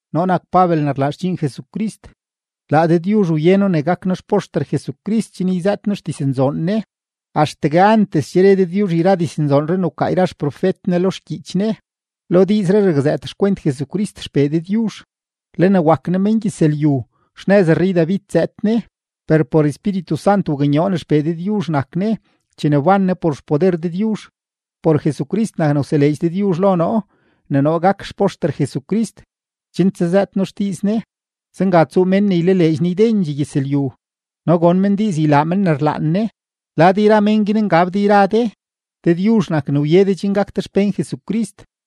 Noo nak Pabel ne rlaa xdxiin Jesucrist. Laa Dëdyuzh wye noo ne gak noo xpoxter Jesucrist chen yzëët noo xdiznzoon Ne. Axtegue antes che re Dëdyuzh yra diznzoonree ne wkaa yra xprofet Ne lo xgyiich Ne, lo diizree rakzëët xkwent Jesucrist XPee Dëdyuzh. Le ne wak Ne mengyëzlyu, xnëz rrey-David zëëd Ne, per por Espíritu Sant waknyoo ne XPee Dëdyuzh nak Ne chene wban Ne por xpoder Dëdyuzh. Por Jesucrist nak ne wseleedx Dëdyuzh lo noo ne noo gak xpoxter Jesucrist, chen tsazëët noo xdiiz Ne; zenga tsuu mén ne ylaleedx Ne ydendxee gyëzlyu no gon men diiz ylaa men ne rlaan Ne. Lad yra men guin ngab de yra de, Dëdyuzh nak ne wye de chen gak de xpén Jesucrist.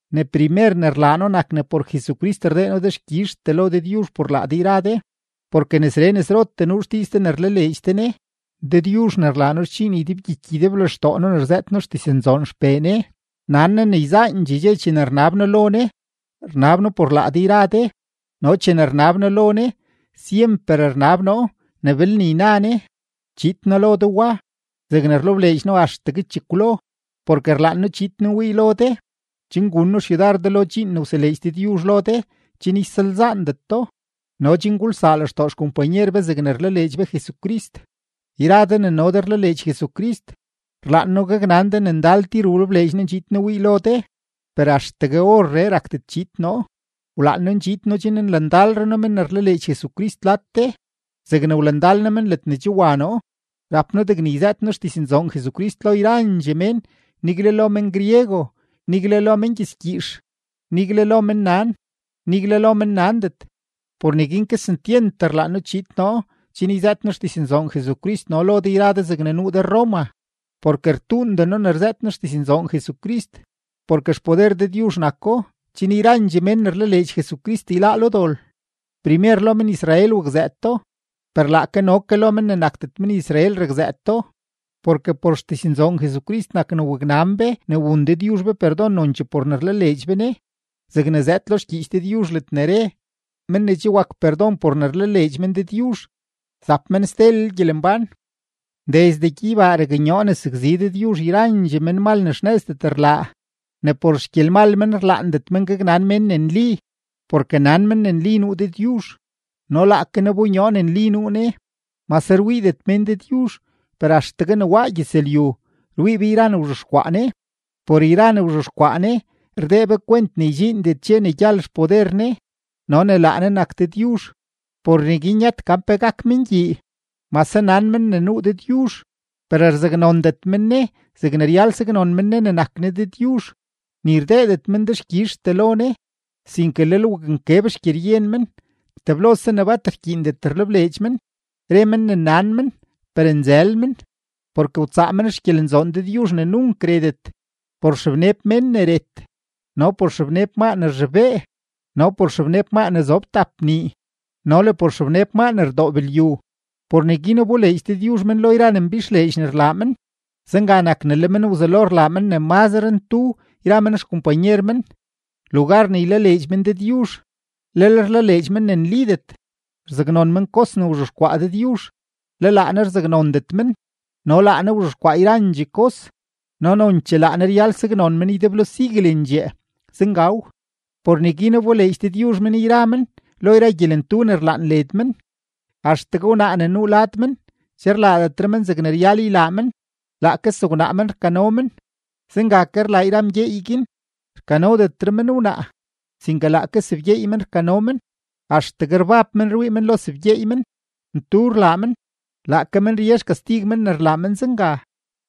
Ne primer ne rlaa noo nak ne por Jesucrist rdee noo dexkyizhtee lo Dëdyuzh por laa de yra de, porke nesree nesrotee nuu xdiiz de ne rlaleedx de Ne. Dëdyuzh ne rlaa noo xdxiin ydebgyiky ydeblextoo noo ne rzëët noo xdiznzoon XPee Ne, nan Ne ne yzaandxee chene rnab noo lo Ne, rnab noo por laa de yra de, no chene rnab noo lo Ne, syemper rnab noo ne belne yna Ne, chiid noo lo de wa, zegne rlebleedx noo axtegue chekwlo. Porke rlaan noo chiid noo wii lo de, chen gun noo xyudar de lo dxiin ne wseleedx Dëdyuzh lo de chen ysalzaandet do no chen gulsaa lextoo xkompanyer be zegne rlaleedx be Jesucrist. Yra de ne no de rlaleedx Jesucrist, rlaan noo gaknan de ne ndal tir wlebleedx noo ndxiid noo wii lo de, per axtegue orree rakdet chiid noo. Wlaan noo ndxiid noo chen nlandalre noo men ne rlaleedx Jesucrist lad de zegne wlandal noo men ledne che wa noo. Rap noo degne yzëët noo xdiznzoon Jesucrist lo yrandxee mén, nigle lo men-griego, nigle lo mengyëzgyiix, nigle lo mennan, nigle lo mennandet. Por neguin kesentyent rlaan noo chiid noo chen yzëët noo xdiznzoon Jesucrist no lo de yra de zegne nuu de Roma. Porke rtuunden noo ne rzëët noo xdiznzoon Jesucrist, porke xpoder Dëdyuzh nako chen yrandxee men ne rlaleedx Jesucrist yláá lo dol, primer lo men-Israel wakzëëto, per laake no ke lo men ne nakdet men-Israel rakzëëto. Porke por xdiznzoon Jesucrist nak ne waknan be ne wun Dëdyuzh be perdon nonchee por ne rlaleedx be Ne, zegne zëëd lo xgyiich Dëdyuzh ledne re: “Men ne che wak perdon por ne rlaleedx men Dëdyuzh zap men stelel gyelembán.” Desde gyeybaa raknyoo ne sakzi Dëdyuzh yra menmal ne xnëzdet rlaa, ne por xgyelmal men rlaandet men gaknan mén ne nli. Porke nan men ne nli nuu Dëdyuzh, no laake Ne wbonyoo ne nli nuu Ne. Mase rwiidet mén Dëdyuzh, per axtegue ne waa gyëzlyu, rwii be yra ne wzhexkwaa Ne; por yra ne wzhexkwaa Ne, rdee be kwent ne ydxiindet dxe ne gyal xpoder Ne no ne laa Ne nak Dëdyuzh; por neguin yëtet gan pe gak men gyii. No mase nan men ne nuu Dëdyuzh, per rzaknondet men Ne zegne ryal saknon men Ne ne nak Ne Dëdyuzh, ni rdeedet men dexkyizhtee lo Ne, sinke lel waknkeb xgyeryen men, teblose ne bat rkyiindet rlebleedx men. Re men ne nan men, per nzël men; porke wtsaa men xgyelenzoon Dëdyuzh ne nunk retet por xebneb mén ne ret, no por xebneb maa ne rzhobee, no por xebneb maa ne zob tap nii, no le por xebneb maa ne rdoob lyu. Por neguin wboleedx Dëdyuzh men lo yra ne mbixleedx ne rlaa men; zenga nak ne le men wzelo rlaa men ne mazre ntudee yra men xkompanyer men. Lugar ne ylaleedx men Dëdyuzh, lel rlaleedx men ne nlidet; rzaknon men kos ne wzhexkwaa Dëdyuzh, le laa Ne rzaknondet men, no laa Ne wzhexkwaa yrandxee kos no nonchee laa Ne ryal ne saknon men ydeblo siguelendxee. Zengaw. Por neguin wboleedx Dëdyuzh men yra men lo yra gyelentu ne rlaan led men, axtegue wnaa ne nuu lad men, che rlaadetre men zegne ryal ylaa men, laake sewnaa men rkano men. Zenga ke rlaa yra mgyeey guin, rkanodetre men wnaa, sinke laake sebgyeey men rkano men, axtegue rbab men rwii men lo sebgyeey men, ntu rlaa men. Laake men rye xkastig men ne rlaa men zenga.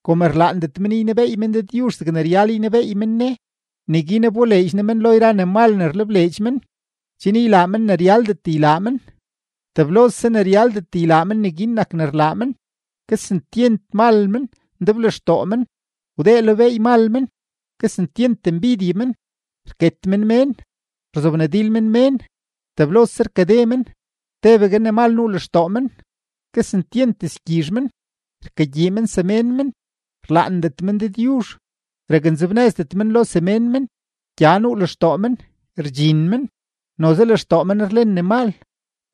Kom rlaandet men ynebeey men Dëdyuzh zegne ryal ynebeey men Ne, neguin wboleedx Ne men lo yra ne mal ne rlebleedx men, chen ylaa men ne ryaldet ylaa men. Teblose ne ryaldet ylaa men, neguin nak ne rlaa men, kesentyent mal men, ndeblextoo men, wdee lo beey mal men, kesentyent mbidye men, rket men mén, rzobnadil men mén, teblose rkade men, tebegue ne mal nuu lextoo men, kesentyent dizgyizh men, rkagyii men semén men, rlaandet men Dëdyuzh, raknzebnëzdet men lo semén men, gya nuu lextoo men, rdxin men, noze lextoo men rlen ne mal,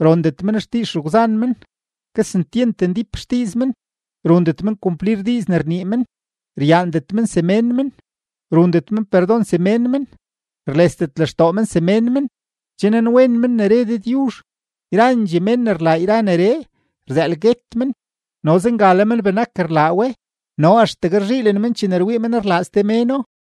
rondet men xdiiz xegwzan men, kesentyent ndíp xdiiz men, rundet men kumplir diiz ne rnii men, ryaandet men semén men, rundet men perdon semén men, rlesdet lextoo men semén men. Che nanwen men ne re Dëdyuzh, yrandxee mén ne rlaa yra neree, rzëël guet men, no zenga le men benak rlaa we, no axtegue rzhiilen men chene rwii men rlaa ste méno.